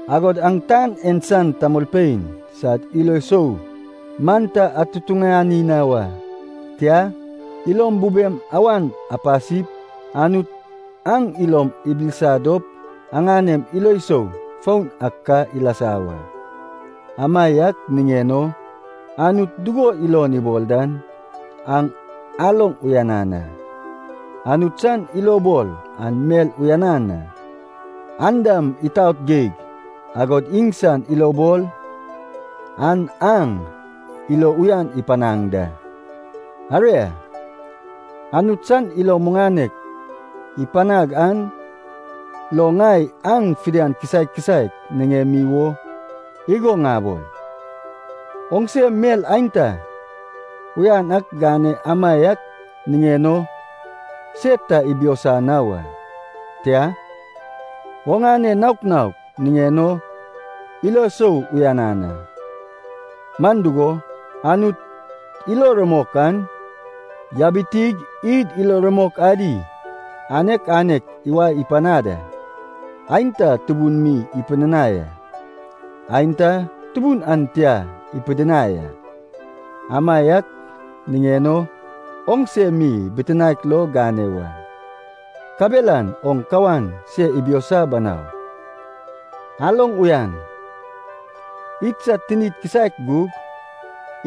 Agod aŋ tan en san tamolpein sad ilo sou man ta atutuŋani na wa. Tia, ilom bubem awan apasip, Anut aŋ ilom ibilisa dop aŋanem ilo sou foun ak ka ilasa wa. Amaiak niŋen o Anut dugo ilon ibol dan aŋ aloŋ uyanan a. Anut san ilobol an mel uyanan a, an dam itaot geig, agod iŋsan ilobol an aŋ ilo uyan ipanaŋ da. Aria, Anut san ilo muŋanek ipanag an lo ŋai aŋ fidian kisaek kisaek niŋemi wo igo ŋabol. Oŋse mel aenta uyan ak gane amaiak niŋen o se ta ibiosa na wa. Tia, oŋane nouk nouk niŋen o ilo isou uyanan a. Man dugo, Anut ilo rumok an yabitig id ilo rumok adi anek anek iwae ipanad a, aenta tubun mi ipidinai a, aenta tubun an tia ipidinai a. Amaiak niŋen o oŋse mi bitinaek lo gane wa, kabelan oŋ kawan se ibiosa banau. Aloŋ uyan. Idsad tinid kisaek gug,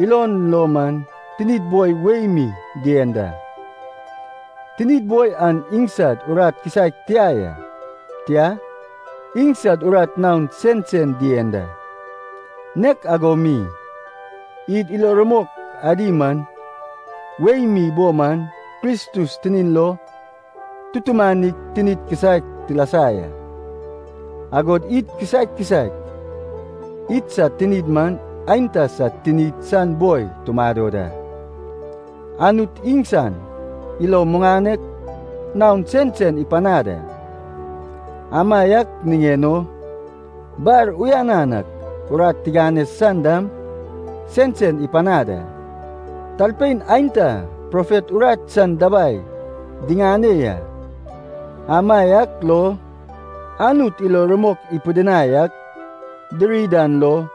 ilon lo man tinid boi wei mi dien da. Tinid boi an iŋsad urat kisaek tia ya. Tia, iŋsad urat naon sensen dien da. Nek ago mi, id ilo rumok adi man wei mi bo man Kristus tinin lo tutumanig tinik kisaek tilasa ya. Agod id kisaek kisaek idsad tinid man aenta sad tinid san boi tumado da. Anut iŋsan ilo muŋanek naon sensen ipanad a, amaiak niŋen o bar uyanan ak urat tigane san dam sensen ipanad da. Talpein aenta profet urat san dabai diŋane ya, amaiak lo Anut ilo rumok ipidinai ak diri dan lo,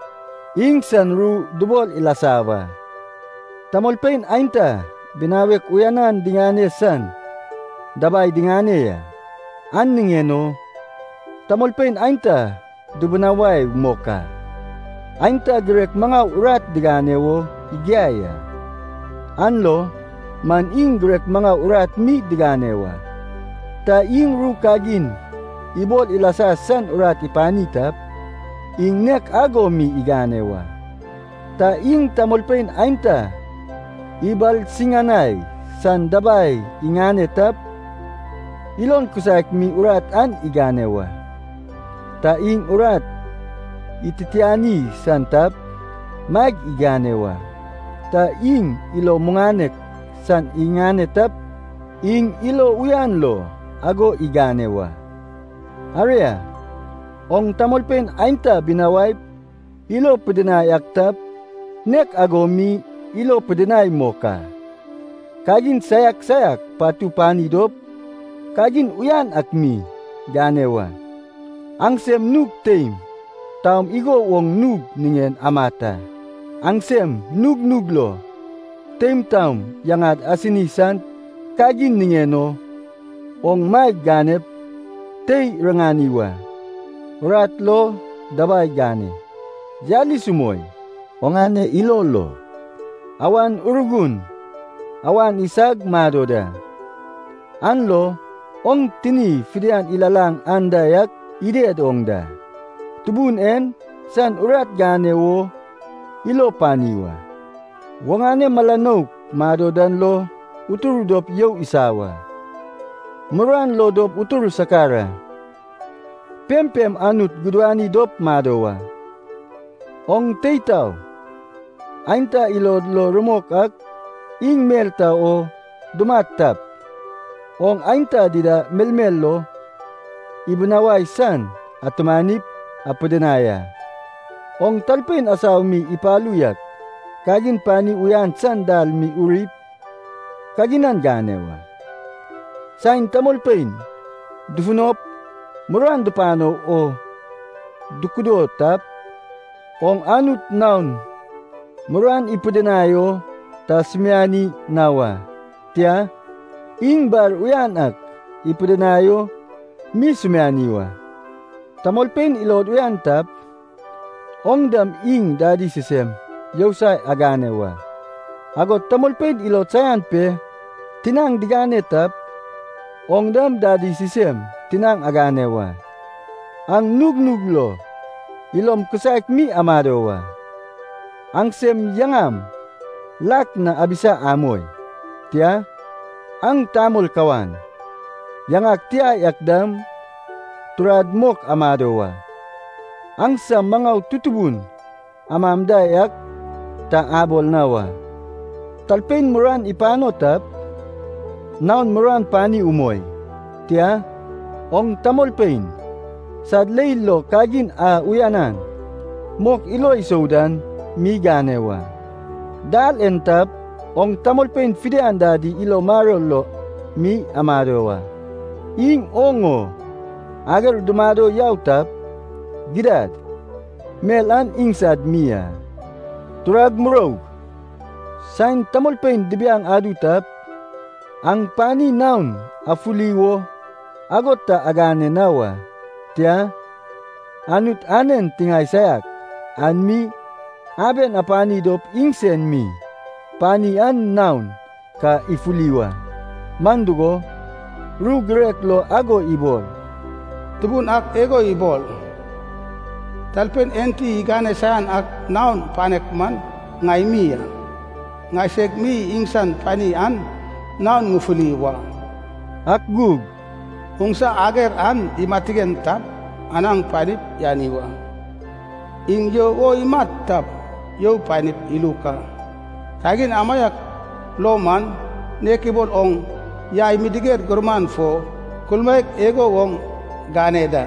iŋsan ru dubol ilasa wa. Tamolpein aenta binawek uyanan digane san dabai diŋane ya. An niŋen o tamolpein aenta dubinawai mok a. Aenta girek maŋau urat digane wo igiai a. An lo man iŋ girek maŋau urat mi digane wa. Ta iŋ ru kagin ibol ilasa san urat ipani tap, iŋ nek ago mi igane wa. Ta iŋ tamolpein aenta ibalsiŋanai san dabai iŋane tap, ilon kisaek mi urat an igane wa. Ta iŋ urat ititiani san tap, maeg igane wa. Ta iŋ ilo muŋanek san iŋane tap, iŋ ilo uyan lo ago igane wa. Aria, oŋ tamolpein aenta binawaip ilo pidinai ak tap, nek ago mi ilo pidinai mok a. Kagin saiak saiak patu pani dop, kagin uyan ak mi gane wa. Aŋsem nug teim taom igo woŋ nug niŋen amat a. Aŋsem nugnug lo teim taom yaŋad asini san kagin niŋen o oŋ maeg ganep tei riŋani wa. Urat lo dabai gane, yalis umoi. Oŋane ilo lo Awan Urgun awan isag mado da, an lo oŋ tini fidian ilalaŋ anda yak ided oŋ da. Tubun en san urat gane wo ilo pani wa. Oŋane mala nouk mado dan lo utur dop you isa wa. Muruan lo dop utur sakar a. Pempem Anut gudani dop mado wa. Oŋ tei tao aenta ilod lo rumok ak iŋ mel ta o dumat tap, oŋ aenta dida melmel lo ibinawai san atumanip apidinai a. Oŋ talpein asau mi ipalu yak kagin pani uyan san dal mi urip, kaginan gane wa. Saen tamolpein dufunop muruan dupano wo dukudo tap, oŋ Anut naon muruan ipidinai o ta sumiani na wa, tia, iŋ bar uyan ak ipidinai o mi sumiani wa. Tamolpein ilod uyan tap, oŋ dam iŋ dadi sisem yousai agane wa. Agod tamolpein ilod saian pe tinaŋ digane tap, oŋ dam dadi sisem tinaŋ gane wa. Aŋ nugnug lo ilom kisaek mi amado wa. Aŋsem yaŋam lak na abisa amoi. Tia, aŋ tamol kawan, yaŋad tia yak dam turad mok amado wa. Aŋsem maŋau tutubu amam da yak ta abol na wa. Talpein muruan ipano tap, naon muruan pani umoi. Tia, oŋ tamolpein sad leil lo kagin a uyanan mok ilo isou dan mi gane wa. Dal yen tap, oŋ tamolpein fidian dadi ilo maror lo mi amado wa. Iŋ oŋ o ager dumado yau tap, gidad mel an iŋsad mi a. Turag muroug, saen tamolpein dibiaŋ adu tap, aŋ pani naon afuli wo ago ta agane na wa. Tia, Anut anen tiŋae saiak an mi aben apani dop iŋsen mi pani an naon ka ifuli wa. Man dugo, ru girek lo ago ibol, “Tubun ak igo ibol, talpein enti igane saian ak naon panek man, ŋai mi a, ŋaiseg mi iŋsan pani an naon ŋufuli wa.” Ak gug, “Oŋsa ager an imatigen tap, anaŋ panip yani wa. Iŋ you o imat tap, you panip iluk a. Kagin amaiak lo man nek ibol oŋ yai midiger gumuran fo kulmaek igo woŋ gane da.”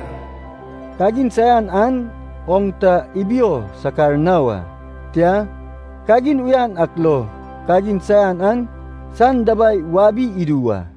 Kagin saian an oŋ ta ibio sakar na wa, tia, kagin uyan ak lo kagin saian an san dabai wabi idu wa.